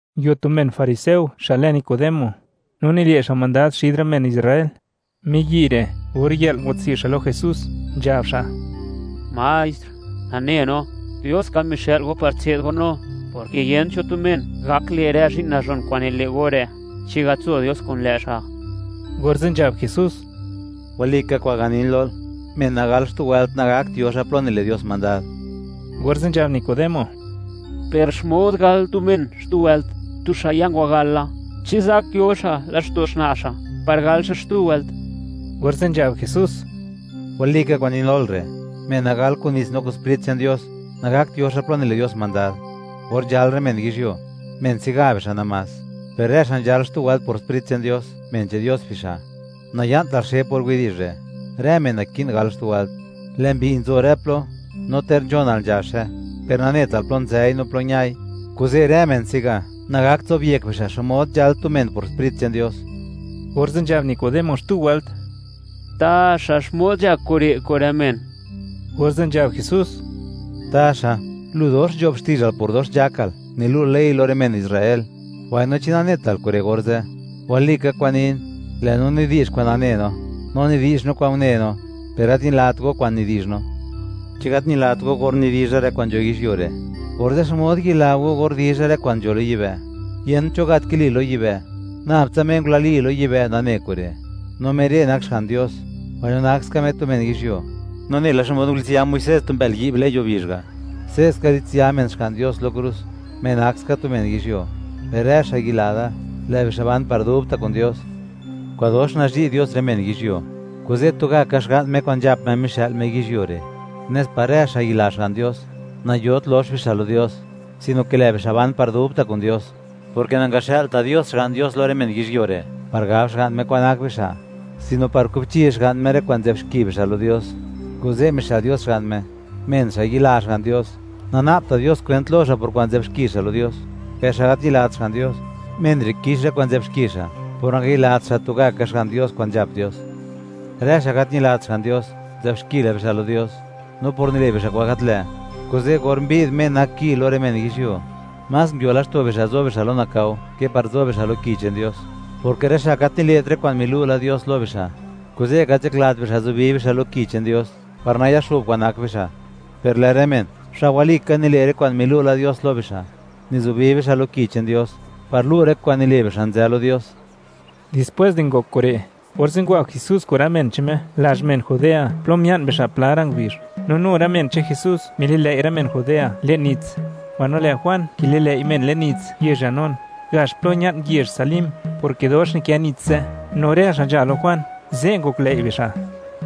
Nguio tu men fariseo xa' lë Nicodemo, no nile' xa' mandad xid rë men Israel. Miyi' re', or yë'l ngwatswi' xa' lo Jesús, nzhab xa': ―Maestr, nane no, Dios ka mixë'l go par tse'd go no, porke yent cho tu men gak le' rë zhi'n nazhon kwa'n nile' go re' chi gat nzo Dios kun lë' xa'. Orze' nzhab Jesús: ―Walika kwa'n ganin lol, men nagal xtu wëlt, nagakt yo xa' plo nile' Dios mandad. Orze' nzhab Nicodemo: ―Per, ¿xmod gal tu men xtu wëlt, tu xa' ya ngwagal la? ¿Chi zak yo xa' laxto' xna' xa' par gal xa' xtu wëlt? Orze' nzhab Jesús: ―Walika kwa'n nin lol re', men nagal kun nits no kun Sprit che'n Dios, nagakt yo xa' plo nile' Dios mandad. Or nzhal rë men yizhyuo, men se'ga bixa' namás; per rë xa' nzhal xtu wëlt por Sprit che'n Dios, men che'n Dios bixa'. Naya'ntal xe por widi'zh re': “Rë men naki'n gal xtu wëlt.” Lë' mbi nzo rë plo, no ter nzhonal nzhaxe, per nanetal plo nzëi no plo ñai. Kuze' rë men se'ga nagakt zobyek bixa' xmod nzhal tu men por Sprit che'n Dios. Orze' nzhab Nicodemo xtu wëlt: ―¿Taxa xmod nzhak kure' kun rë men? Orze' nzhab Jesús: ―Taxa, lu dox nzho'b xti'zhal por dox nzhakal nilu'l Ley lo rë men Israel, mbaino, ¿chi nanetal kure' orze'? Walika kwa'n nin, lë' no nidi'zh kwa'n nane no, no nidi'zh no kwa'n une no, per gat ñilat go kwa'n nidi'zh no. Chi gat ñilat go or nidizha rë kwa'n nzho yizhyuo re', orze', ¿xmod yila go or dizha rë kwa'n nzho lo yibë'? Yent cho gat ya lo yibë', nab tsa Me ngulali lo yibë' nane kure', no Me re' nak Xga'n Dios; mbaino nak ska Me tu men yizhyuo. No nela xmod ngulitsya Muisés tu mbë'l yi'b le'n yuo bizh ga', se'ska litsya men Xga'n Dios lo krus, Me nak ska tu men yizhyuo, per rë xa' yila da, lë' bixa' ban par dubta' kun Dios. ’Kwa'dox nazhi' Dios rë men yizhyuo, kuze' tugaka Xga'n Me kwa'n nzhap Me mixë'l Me yizhyuo re', nes par rë xa' yila Xga'n Dios, nayot lox bixa' lo Dios, sino ke lë' bixa' ban par dubta' kun Dios, porke nangaxë'lta' Dios Xga'n Dios lo rë men yizhyuo re' par gab Xga'n Me kwan nak bixa', sino par kubchi Xga'n Me rë kwa'n nzë'b xki bixa' lo Dios, kuze' mixë'l Dios Xga'n Me. Men xa' yila Xga'n Dios, nana'bta' Dios kwent lo xa' por kwa'n nzë'b xki xa' lo Dios; per xa' gat ñilat Xga'n Dios, men re' kix rë kwa'n nzë'b xki xa' por nangayilat xa' tugaka Xga'n Dios kwa'n nzhap Dios. Rë xa' gat ñilat Xga'n Dios, nzë'b xki la bixa' lo Dios, no por nile' bixa' kwa'n gat lë', kuze' or mbi'd Me nak Ki lo rë men yizhyuo, más nguio laxto' bixa' zo bixa' lo nakao ke par zo bixa' lo Ki che'n Dios, porke rë xa' gat nile't rë kwa'n milu' la Dios lo bixa', kuze' gat nzhaklat bixa' zubi bixa' lo Ki che'n Dios par nayaxo'b kwa'n nak bixa'. Per lë' rë men, xa' walika nile' rë kwa'n milu' la Dios lo bixa', nizubi bixa' lo Ki che'n Dios, par lu', lë' rë kwa'n nile' bixa', nzë lo Dios. Dispwés di ngok kure', orze' ngwa Jesús kun rë men che'n Me lazh men Judea plo mia'n bixa' pla ra' ngubizh, no nu rë men che'n Jesús mililëi' rë men Judea le'n nits. Mbaino lë' Juan kililëi' men le'n nits yezh Enón, gax plo ña'n yezh Salim, porke dox nikë nits ze', no rë xa' nzha lo Juan, ze' ngoklëi' bixa'.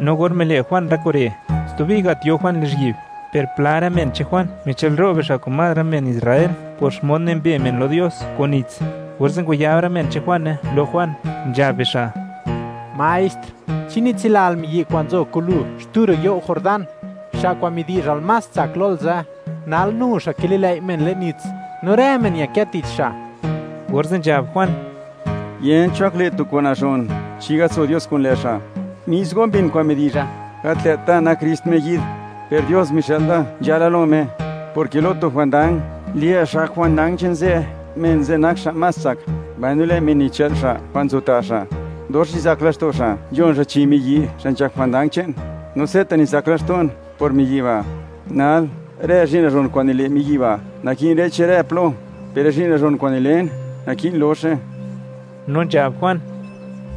No or mile' Juan rë kure', stubi gat yo Juan lizhyi'b, per pla rë men che'n Juan michë'lro' bixa' kun más rë men Israel por xmod nimbe men lo Dios kun nits, orze' ngwayab rë men che'n Juane lo Juan, nzhab bixa': ―Maestr, chi nitsilal miyi' kwa'n nguzo kun lu xtu ro' you' Jordán, xa' kwa'n midi'zhal más tsak lol ze', nal nu xa' kililëi' men le'n nits, no rë men ñakë tich xa'. Orze' nzhab Juan: ―Yent cho gak le' tu kwa'n nazhon chi gat nzo Dios kun lë' xa'. Mis go mbin kwa'n midizha, gat lë't da nak Krist Me yi'd. Per Dios mixë'l da nzhala lo Me. Porke lo tu jwandang, lë' xa' gak jwandang che'n ze', men ze' nak xa' más tsak; mbaino lë' men nichë'l xa' kwa'n nzo ta' xa', dox nizak laxto' xa' nzhon xa' chi miyi' xa' nzhak jwandang che'n. No se'ta' nizak laxto'n por miyi' ba'. Nal, rë zhi'n nazhon kwa'n nile' miyi' ba' naki'n re'che rë plo, per rë zhi'n nazhon kwa'n nilen, naki'n loxe. No nzhab Juan: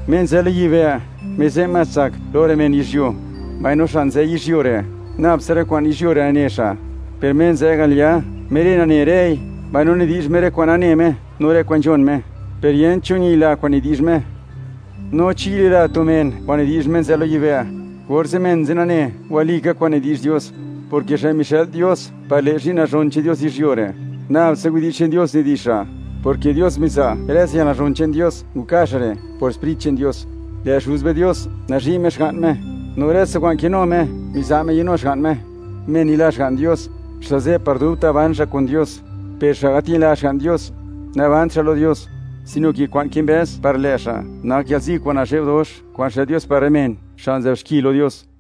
―Me nzë lo yibë', Me ze' más tsak lo rë men yizhyuo; mbaino xa' nzë yizhyuo re', nab tsa rë kwa'n yizhyuo re' nane xa'. Per Me nzë al ya, Me re' nane rëi, mbaino nidi'zh Me rë kwa'n nane Me no rë kwa'n nzhon Me, per yent cho ñila kwa'n nidi'zh Me. No chi yila tu men kwa'n nidi'zh Me nzë lo yibë', orze' men ze' nane, walika kwa'n nidi'zh Dios, porke xa' mixë'l Dios par le' zhi'n nazhon che'n Dios yizhyuo re', nab tsa widi'zh che'n Dios nidi'zh xa', porke Dios miza' rë tsa yalnazhon che'n Dios nka' xa' re' por Sprit che'n Dios. Lë' Xuz be Dios nazhi' Me Xga'n Me, no rë tsa kwa'n kinu Me miza' Me yanu Xga'n Me. Men yila Xga'n Dios, xa' ze' par dubta' ban xa' kun Dios; per xa' gat ñila Xga'n Dios, nabant xa' lo Dios, sino ke kwa'n kimbëz par lë' xa' nak yalzi kwa'n nazhe'b dox kwa'n xë'l Dios par rë men xa' nzë'b xki lo Dios.